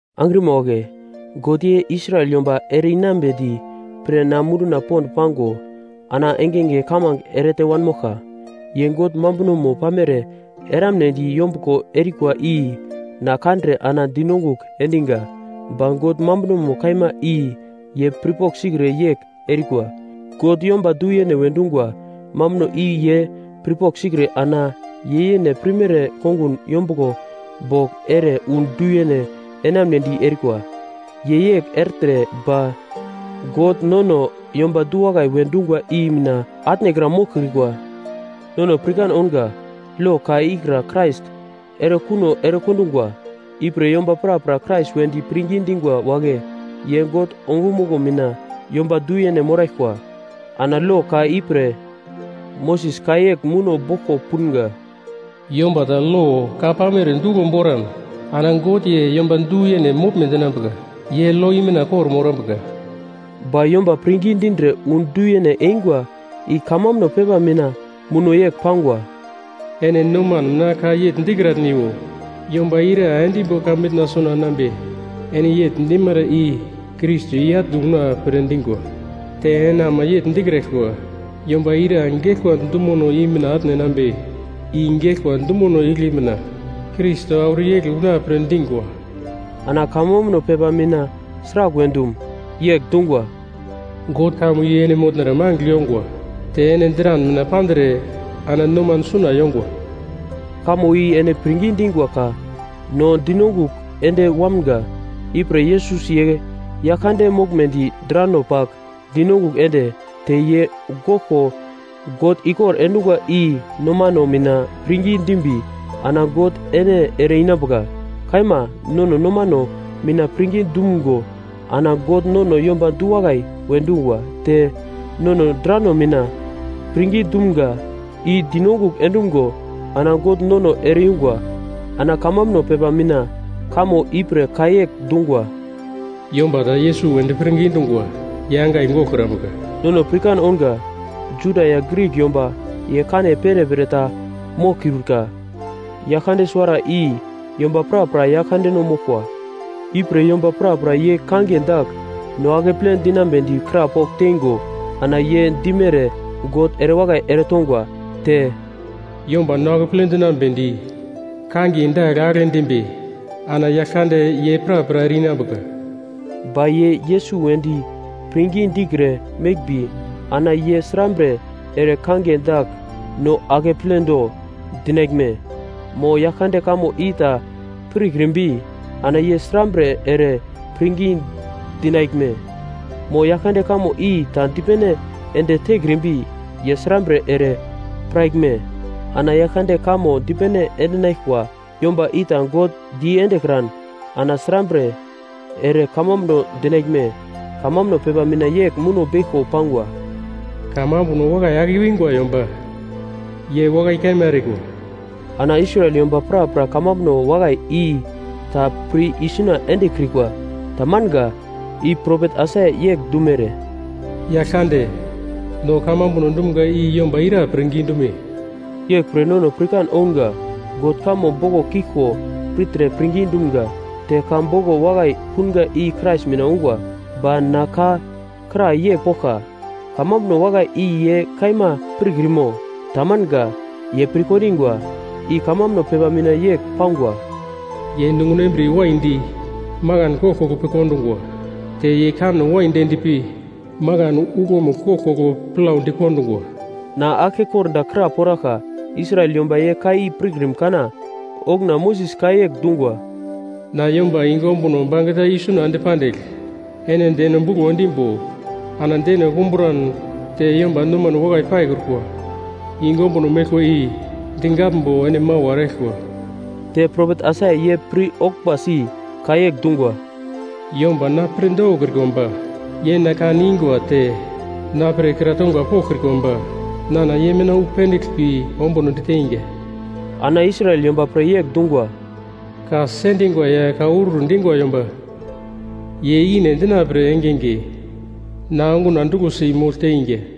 Angrima wagle, God ye Israel yomba ere-inambedi pre na munduna pond pango ana engenge kamange erete wanmoglka. Ye God mambunomo pamere eramnedi yombuglo erikwa i na kandre ana dinongugl endiga, ba God mambunomo kaima i ye pirpogl sikre yegl erikwa. God yomba du-yene we dungwa mambuno i ye pirpogl sikre ana ye yene pirmere kongun yombuglo bogl ere wu du-yene enamunedi erikwa. Ye yegl ertre ba God nono yomba du-wakai we dungwa i mina atnekra moglkrikwa. Nono pirkan ounga lo ka ikra Krais erekuno erekondungwa. Ipre yomba prapra Krais wedi pirngi dingwa wagle ye God ongumuglo mina yomba du-yene moraglkwa. Ana lo ka ipre Moses ka yegl muno boglko punga: “Yomba ta lo ka pamere duglo boran ana God ye yomba du-yene moglme dinambuka ye lo i mina kor-morambuka.” Ba yomba pirngi dindre wu du-yene eingwa i kamambuno pepa mina muno yegl pangwa: “Ene noman mina ka yegl dikratniwo, ‘Yomba ira endimbo heven suna enambe?’” Ene yegl dimara i Krais i-atne una pre dingwa. Te ene ama yegl dikraglkwa, “‘Yomba ira geglkwa dumono i mina atne enambe?’” I geglkwa dumono igle mina Krais auro i-egli una pre dingwa. Ana kamambuno pepa mina sraglwe dum? Yegl dungwa: “God kamo i ene motnara mangigl yongwa, te ene dran mina pandre, ana noman suna yongwa.” Kamo i ene pirngi dingwa ka, no dinongugl ende wamga. Ipre Yesus ye Yaglkande moglmedi drano pagl dinongugl ende, te ye goglko God ikor endungwa i nomano mina pirngi dimbi ana God ene ere-inambuka. Kaima, nono nomano mina pirngi dumgo ana God nono yomba du-wakai we dungwa. Te nono drano mina pirngi dumga i dinongugl endumgo ana God nono ere-yungwa. Ana kamambuno pepa mina kamo ipre ka yegl dungwa, “Yomba ta Yesus wedi pirngi dungwa ye angai goglkrambuka.” Nono pirkan ounga: Juda ya Grik yomba ye kane perepere ta moglkiurka. Yaglkande suwara i yomba prapra Yaglkandeno moglkwa. Ipre yomba prapra ye kangiye dagl no akeple dinambedi krapogl teingo ana ye dimere God ere wakai eretongwa. Te, “Yomba no akeple dinambedi kangiye dagl agle dimbi ana Yaglkande ye prapra ere-inambuka.” Ba ye Yesus wedi pirngi dikre meglmbi ana ye srambre ere kangiye dagl no akepledo dinaglme? Mo Yaglkande kamo i ta pirkrimbi ana ye srambre ere pirngi dinaglme? Mo Yaglkande kamo i ta dipene ende tekrimbi ye srambre ere piraglme? Ana Yaglkande kamo dipene endinaglkwa yomba i ta God diendekran ana srambre ere kamambuno dinaglme? Kamambuno pepa mina yegl muno beglko pangwa: “Kamambuno wakai ake i-wingwa yomba ye wakai kaima erikwa.” Ana Israel yomba prapra kamambuno wakai i ta pir isuna endekrikwa. Tamanga. I propet Aisaia yegl dumere, “Yaglkande, no kamambunono dumga i yomba ira pirngi dume?” Yeglpre nono pirkan ounga; God kamo boglo kiglko pirtre pirngi dumga, te ka boglo wakai punga i Krais mina ungwa. Ba na ka kra yegl poglka, kamambuno wakai i ye kaima pirkrimo? Tamanga. Ye pirkondingwa. I kamambuno pepa mina yegl pangwa: “Ye nunguno embriye waidi makan koglkoglo pi kondungwa, te ye kanno waidi endpi makan uglomugl koglkoglo plau dikondungwa.” Na aglke kordagl kraporaglka: Israel yomba ye ka i pirkrim kana? Okuna Moses ka yegl dungwa, “Na, yomba yungu ombuno bangeta isuna ende pandigl ene deno buglo endimbo ana deno kumbran te yomba nomane wakai paikrukwa yungu ombuno meglkwa i digaglmbo ene mawa eraglkwa!” Te propet Aisaia ye pir-oglmbasi ka yegl dungwa, “Yomba, na pre dokokrikwa ba ye na kan ingwa te na pre kra tongwa poglkrikwa ba nana ye mina wu pendigl pi ombunodi teinga.” Ana Israel yomba pre yegl dungwa, “Ka sendingwa ya ka urur dingwa yomba ye ikine endina pre engenge na onguna duglosi mogl teinga.”